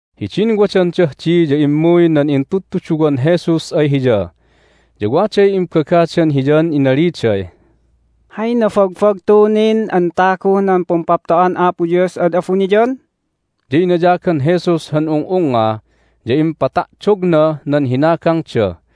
Hidin wadandah di ya immuy nan intudtuduwan Jesus ay Hiya, ya waday imbagadan Hiyan inaliday, "Hay nabagbagtu nin an taguh nan Pumpapto'an Apo Dios ad abuniyan?" Ya inayagan Jesus han ung'ungnga, ya impata'dognah nan hinagangda,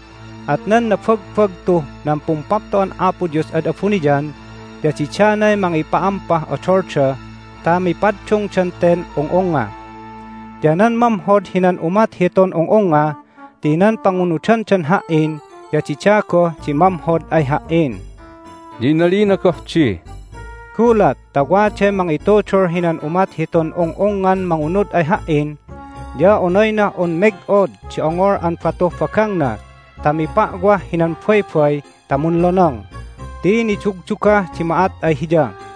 At nan nabagbagtuh nan Pumpapto'an Apo Dios ad abuniyan ya didanay mangipa'ampah odolda ta mipaddungdan ten ung'ungnga. Ya nan mamhod hinan umat hitun ung'ungnga ti nan pangunudandan Ha"in ya dida goh di mamhod ay Ha"in." Ya inalina goh di, "Gulat ta waday mangitudul hinan umat hitun ung'ungngan mangunud ay Ha"in ya onaynah un meg'od di ongol an batuh bagangna ta mipa'wah hinan baybay ta munlonong, ti nidugdugah di ma'at ay hiya.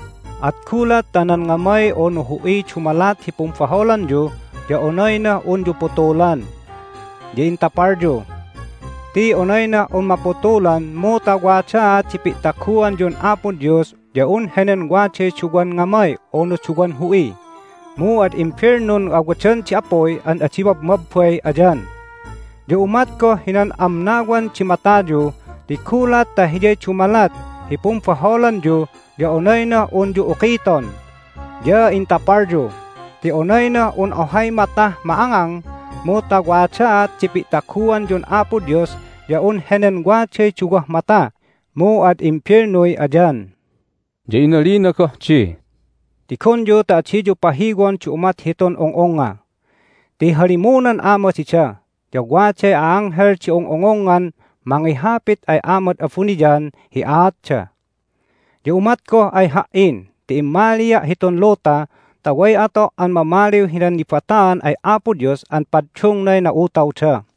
At gulat ta nan ngamay unu hu'iy dumalat hi pumbaholanyu ya onaynah unyu putulan, ya intapalyu. Ti onaynah un maputulan mu ta wadaat di pi'taguanyun Apo Dios ya un henen waday duwan ngamay unu duwan hu'i, mu ad imbelnun awadan di apuy an adi mabmabbay ayan. Ya umat goh hinan amnawan di matayu ti gulat ta hiyay dumalat hi pumbaholanyu ya onaynah unyu ukiton, ya intapalyu. Ti onaynah un ohay matah ma'angang mu ta wadaat di pi'taguanyun Apo Dios ya un henen waday duwah mata, mu ad imbelnuy ayan." Ya inalina goh di, "Tigonyu ta adiyu pahiwon di umat hitun ung'ungnga. Ti halimunan Ama dida, ya waday a'anghel di ung'ungungngan mangihapit ay Amad abuniyan hi aatda. Ya umat goh ay Ha"in ti immalia' hitun luta ta way ato' an mamaliw hinan nibataan ay Apo Dios an paddungnay na'utawda.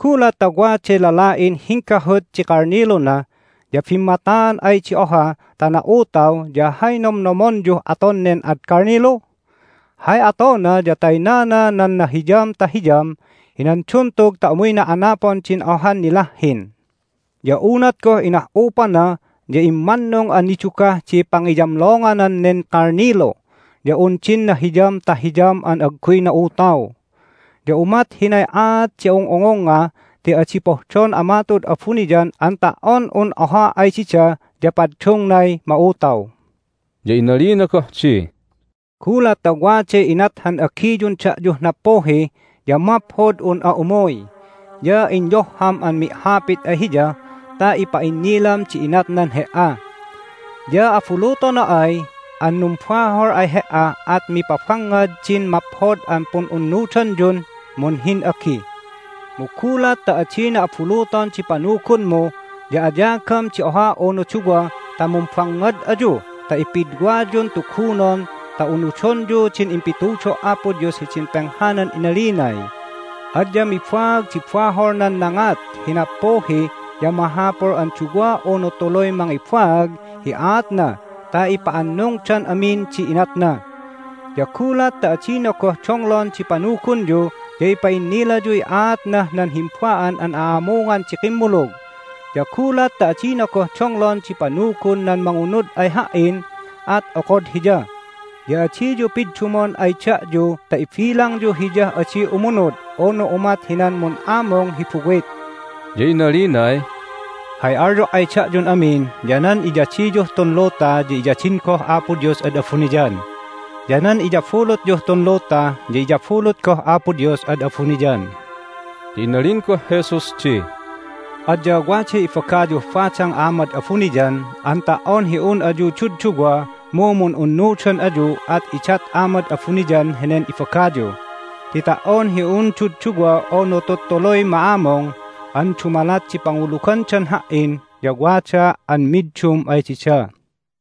Gulat ta waday lala'in hinggahut di kalniluna ya bimmataan ay di oha ta na'utaw ya hay nomnomonyuh aton nen ad kalnilu? Hay atona ya taynana nan nahiyam ta hiyam hinan duntug ta umuyna anapon din ohan nilahhin. Ya unat goh inah'upana ya immannung an nidugah di pangiyamlonganan nen kalnilu ya un din nahiyam ta hiyam an agguy na'utaw. Ya umat hinay aat di ung'ungungnga ti adi pohdon Ama tu'ud abuniyan an ta"on un oha ay dida ya paddungnay ma'utaw." Ya inalina goh di, "Gulat ta waday inat han agiyun da'yuh nappuhi ya maphod un'a umuy, ya inyohham an mi'hapit ay hiya ta ipa'innilam di inatnan he"a. Ya abulutona ay an numbahol ay he"a at mipabangngad din maphod an pun'unnudanyun munhin'agi. Mu gulat ta adina abuluton di panugunmu ya ayagam di oha unu duwa ta mumbangngad ayu ta ipidwayun tugunon ta unudonyu din impitudo' Apo Dios hidin penghanan inalinay, Adya mibaag di bahol nan nangat hi nappuhi ya mahapul an duwa unu tuluy mangibaag hi aatna ta ipa'annungdan amin di inatna. Ya gulat ta adina goh donglon di panugunyu ya ipa'innilayuy aatnah nan himba'an an a'amungan di kimmulug. Ya gulat ta adina goh donglon di panugun nan mangunud ay Ha"in at okod hiya, ya adiyu piddumon ay da'yu ta ibilangyu hiyah adi umunud unu umat hinan mun'amung hi buwit." Ya inalinay, "Hay alyo' ay da'yun amin ya nan iyadiyuh tun luta ya iyadin goh Apo Dios ad abuniyan, ya nan iyabulutyuh tun luta ya iyabulut goh Apo Dios ad abuniyan." Ya inalin goh Jesus di, "Adya waday ibagayuh badang Amad abuniyan an ta"on hi un ayu dudduwa mu mun'unnudan ayu at idat Amad abuniyan henen ibagayu. Ti ta"on hi un dudduwa unu tuttuluy ma'amung an dumalat di pangulugandan Ha"in ya wadaa' an middum ay dida."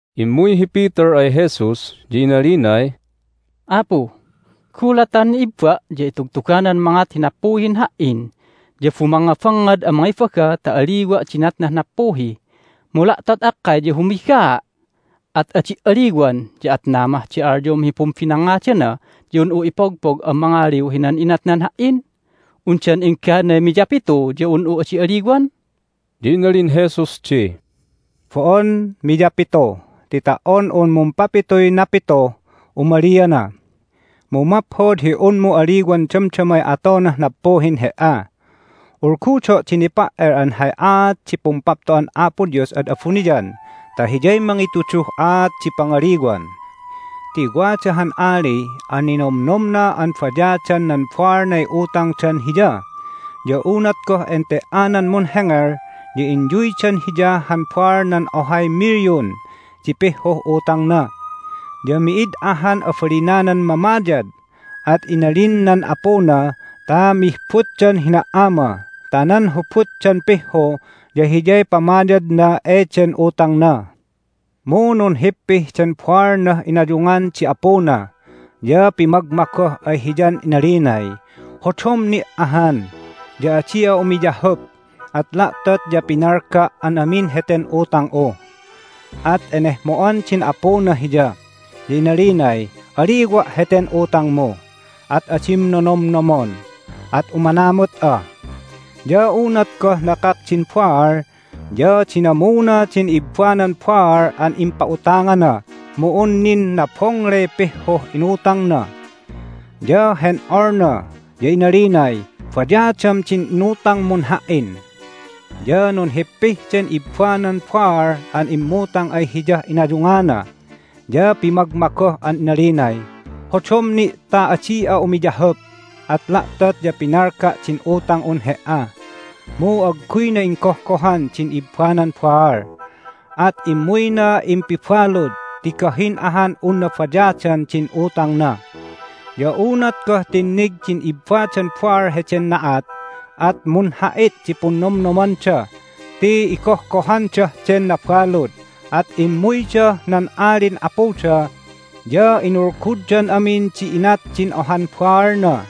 Immuy hi Peter ay Jesus, ya inalinay, "Apu, gulat ta han ibba' ya itugtuganan mangat hi nappuhin ha"in ya bumangngabangngad an mangibaga ta aliwa' di inatnah nappuhi. Mu la'tot akkay ya humigaa', at adi' aliwan, ya atna mah di alyom hi pumbinnangngadana ya un'u ipogpog an mangaliw hinan inatnan ha"in? Undan engganay miyapitu ya un'u adi aliwan?" Ya inalin Jesus di, "Bo'on miyapitu, ti ta"on un mumpapituy napituh umaliana! Mu maphod hi unmu aliwan damdamay atonah nappuhin he"a. Ulgudo' di nipa"el an hay aat di Pumpapto'an Apo Dios ad abuniyan ta hiyay mangituduh aat di pangaliwan. Ti wada han ali an ninomnomna an bayadan nan baalnay utangdan hiya. Ya unat goh ente"anan munhengel ya inyuydan hiya han baalnan ohay milyon di pihhuh utangna. Ya mi'id ahan abalinanan mamayad, at inalin nan apuna ta mihbutdan hina"ama ta nan hubutdan pihhu ya hiyay pamayadna eden utangna. Mu nunhippih den baalnah inayungan di apuna, ya pimagmagoh ay hiyan inalinay, Hodom ni' ahan, ya adi'a umiyahup, at la'tot ya pinalga' an amin heten utang'u! At enehmo'an din apuna hiya, ya inalinay, Aliwa' heten utangmu, at adim nonomnomon, at umanamut'a. Ya unat goh nakak din baal ya dinamuna din ibbanan baal an impa'utangana, mu un nin nabongley pihhuh inutangna. Ya hen'olna, ya inalinay, Bayadam din inutangmun ha"in! Ya nunhippih den ibbanan baal an immutang ay hiyah inayungana, ya pimagmagoh an inalinay, Hodom ni' ta adi'a umiyahup, at la'tot ya pinalga' din utang'un he"a! Mu agguyna inggohgohan din ibbanan baal, at immuyna impibalud ti gahin ahan unna bayadan din utangna. Ya unat goh tinnig din ibbadan baal heden na'at at munha'it di punnomnomanda ti igohgohandah den nabalud, at immuydah nan alin apuda, ya inulguddan amin di inat din ohan baalna.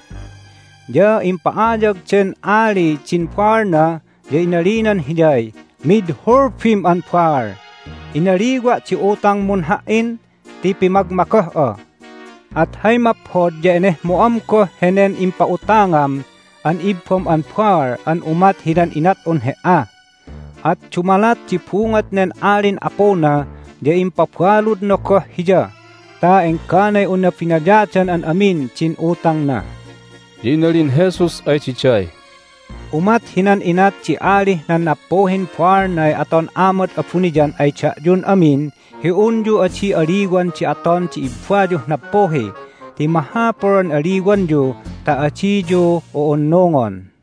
Ya impa'ayag den ali din baalna, ya inalinan hiyay, Mid hulbim an baal! Inaliwa' di utangmun ha"in ti pimagmagoh'a, at hay maphod ya enehmo'am goh henen impa'utangam an ibbam an baal an umat hinan inat'un he"a! At dumalat di bungot nen alin apuna ya impabaludna goh hiya ta engganay unna binayadan an amin din utangna." Ya inalin Jesus ay diday, "Umat hinan inat di alih nan nappuhin baalnay aton Amad abuniyan ay da'yun amin hi unyu adi aliwan di aton di i'ibbayuh nappuhi ti mahapul an aliwanyu ta adiyu u'unnungon."